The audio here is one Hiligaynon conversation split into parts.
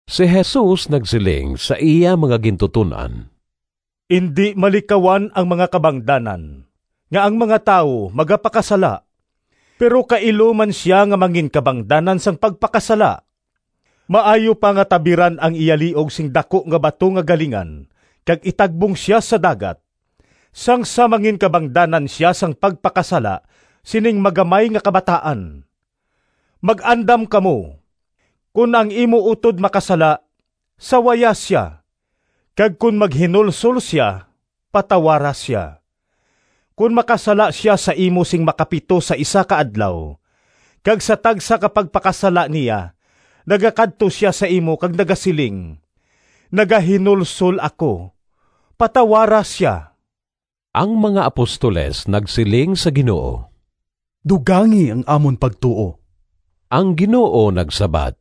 Si Jesus nagsiling sa iya mga gintuton-an, “Indi malikawan ang mga kabangdanan nga ang mga tawo magapakasala, pero kailo man sia nga manginkabangdanan sang pagpakasala. Maayo pa nga tabiran ang iya liog sing daku nga bato nga galingan kag itagbong sia sa dagat, sang sa manginkabangdanan sia sang pagpakasala sining magamay nga kabataan. Mag-andam kamo! “Kon ang imo utod makasala, sawaya sia, kag kon maghinulsol sia, patawara sia. Kon makasala sia sa imo sing makapito sa isa ka adlaw, kag sa tagsa ka pagpakasala niya nagakadto sia sa imo kag nagasiling, ‘Nagahinulsol ako,’ patawara sia.” Ang mga apostoles nagsiling sa Ginoo, “Dugangi ang amon pagtuo.” Ang Ginoo nagsabat,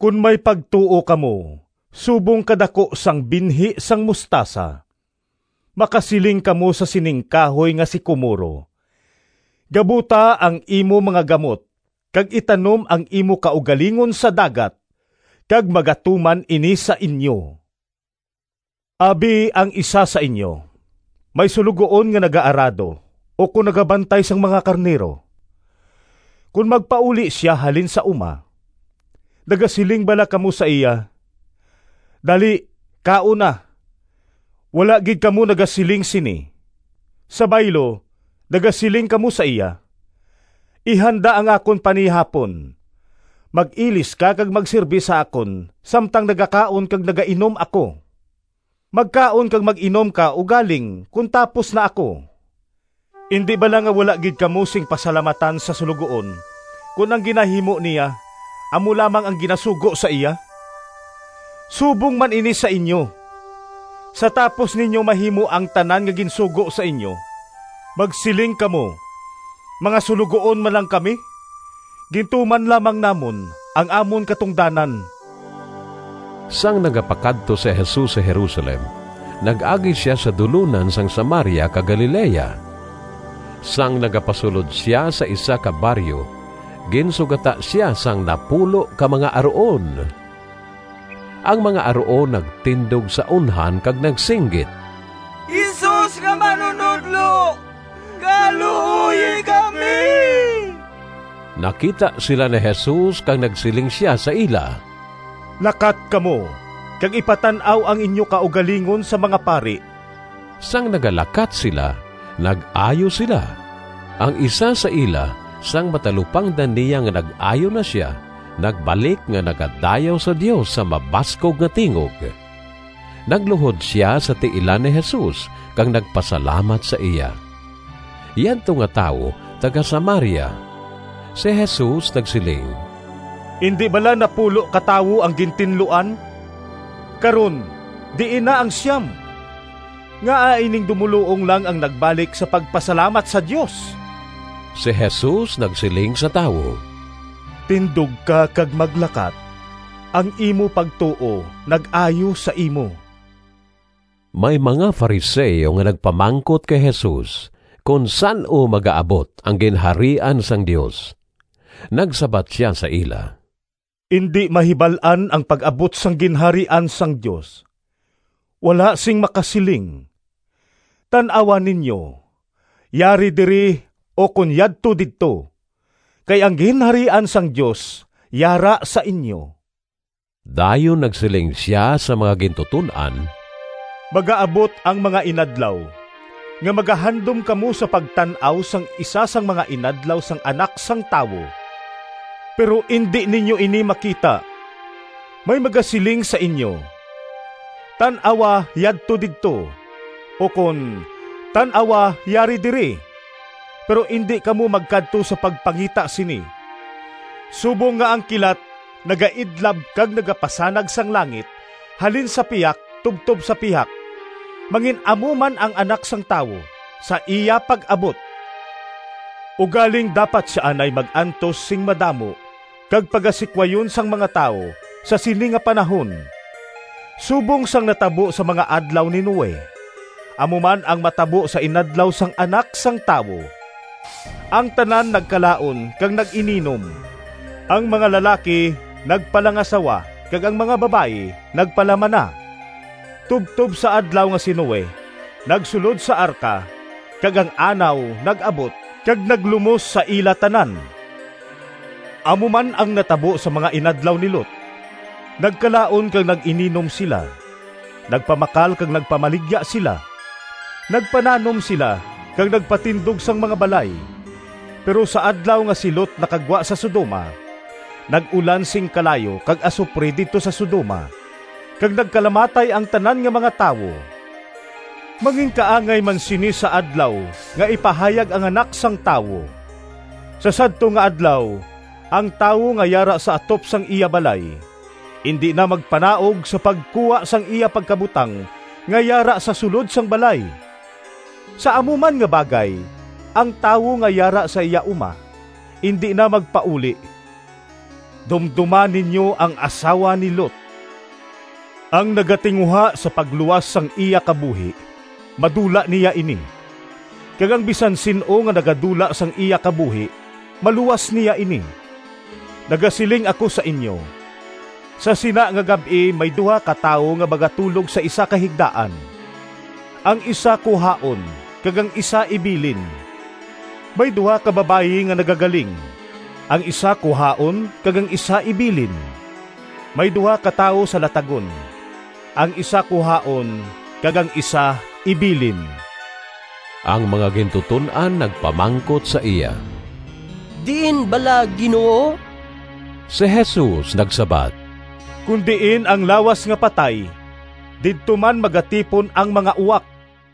“Kon may pagtuo kamo subong ka daku sang binhi sang mostasa makasiling kamo sa sining kahoy nga sikomoro, ‘Gabuta ang imo mga gamot kag itanom ang imo kaugalingon sa dagat!’ kag magatuman ini sa inyo.” “Abi ang isa sa inyo may suloguon nga nagaarado ukon nagabantay sang mga karnero. Kon magpauli sia halin sa uma, nagasiling bala kamo sa iya, ‘Dali, kaon na’? Wala gid kamo nagasiling sini. Sa baylo, nagasiling kamo sa iya, ‘Ihanda ang akon panihapon, mag-ilis ka kag magsirbe sa akon samtang nagakaon kag nagainom ako. Magkaon kag mag-inom ka ugaling kon tapos na ako.’ Indi bala nga wala gid kamo sing pasalamatan sa suloguon kon ang ginahimo niya amo lamang ang ginasugo sa iya? Subong man ini sa inyo; sa tapos ninyo mahimo ang tanan nga ginsugo sa inyo, magsiling kamo, ‘Mga suloguon man lang kami. Gintuman lamang namon ang amon katungdanan.’” Sang nagapakadto si Jesus sa Jerusalem nag-agi sia sa dulonan sang Samaria kag Galilea. Sang nagapasulod sia sa isa ka baryo ginsugata sia sang napulo ka mga aruon. Ang mga aruon nagtindog sa unhan kag nagsinggit, “Jesus nga manunodlo, kaluoyi kami!” Nakita sila ni Jesus kag nagsiling sia sa ila, “Lakat kamo kag ipatan-aw ang inyo kaugalingon sa mga pari.” Sang nagalakat sila nag-ayo sila. Ang isa sa ila, sang matalupangdan niya nga nag-ayo na sia, nagbalik nga nagadayaw sa Dios sa mabaskog nga tingog. Nagluhod sia sa tiilan ni Jesus kag nagpasalamat sa iya. Yadto nga tawo taga-Samaria. Si Jesus nagsiling, “Indi bala napulo ka tawo ang gintinluan? Karon diin na ang siyam? Ngaa ining dumoluong lang ang nagbalik sa pagpasalamat sa Dios?” Si Jesus nagsiling sa tawo, “Tindog ka kag maglakat. Ang imo pagtuo nag-ayo sa imo.” May mga Fariseo nga nagpamangkot kay Jesus kon san-o magaabot ang Ginharian sang Dios. Nagsabat sia sa ila, “Indi mahibal-an ang pag-abot sang Ginharian sang Dios. Wala sing makasiling, ‘Tan-awa ninyo, yari diri!’ ukon ‘Yadto didto!’ kay ang Ginharian sang Dios yara sa inyo.” Dayon nagsiling sia sa mga gintuton-an, “Magaabot ang mga inadlaw nga magahandom kamo sa pagtan-aw sang isa sang mga inadlaw sang Anak sang Tawo, pero indi ninyo ini makita. May magasiling sa inyo, ‘Tan-awa, yadto didto!’ ukon, ‘Tan-awa, yari diri.’ Pero indi kamo magkadto sa pagpangita sini. Subong nga ang kilat nagaidlab kag nagapasanag sang langit halin sa pihak tubtob sa pihak, mangin-amo man ang Anak sang Tawo sa iya pag-abot. Ugaling dapat sia anay mag-antos sing madamo kag pagasikwayon sang mga tawo sa sini nga panahon. Subong sang natabo sa mga adlaw ni Noe, amo man ang matabo sa inadlaw sang Anak sang Tawo. Ang tanan nagkalaon kag nag-ininom, ang mga lalaki nagpalangasawa kag ang mga babayi nagpalamana, tubtob sa adlaw nga si Noe nagsulod sa arka kag ang anaw nag-abot kag naglumos sa ila tanan. Amo man ang natabo sa mga inadlaw ni Lot. Nagkalaon kag nag-ininom sila, nagpamakal kag nagpamaligya sila, nagpananom sila kag nagpatindog sang mga balay. Pero sa adlaw nga si Lot nakagwa sa Sodoma, nag-ulan sing kalayo kag asupre didto sa Sodoma kag nagkalamatay ang tanan nga mga tawo. Manginkaangay man sini sa adlaw nga ipahayag ang Anak sang Tawo. “Sa sadto nga adlaw ang tawo nga yara sa atop sang iya balay indi na magpanaog sa pagkuha sang iya pagkabutang nga yara sa sulod sang balay. Sa amo man nga bagay, ang tawo nga yara sa iya uma indi na magpauli. Dumdoma ninyo ang asawa ni Lot. Ang nagatinguha sa pagluwas sang iya kabuhi madula niya ini, kag ang bisan sin-o nga nagadula sang iya kabuhi maluwas niya ini. Nagasiling ako sa inyo, sa sina nga gab-i may duha ka tawo nga magatulog sa isa ka higdaan, ang isa kuhaon kag ang isa ibilin. May duha ka babayi nga nagagaling, ang isa kuhaon kag ang isa ibilin. [ May duha ka tawo sa latagon, ang isa kuhaon kag ang isa ibilin.]” Ang mga gintuton-an nagpamangkot sa iya, “Diin bala, Ginoo?” Si Jesus nagsabat, “Kon diin ang lawas nga patay, didto man magatipon ang mga uwak.”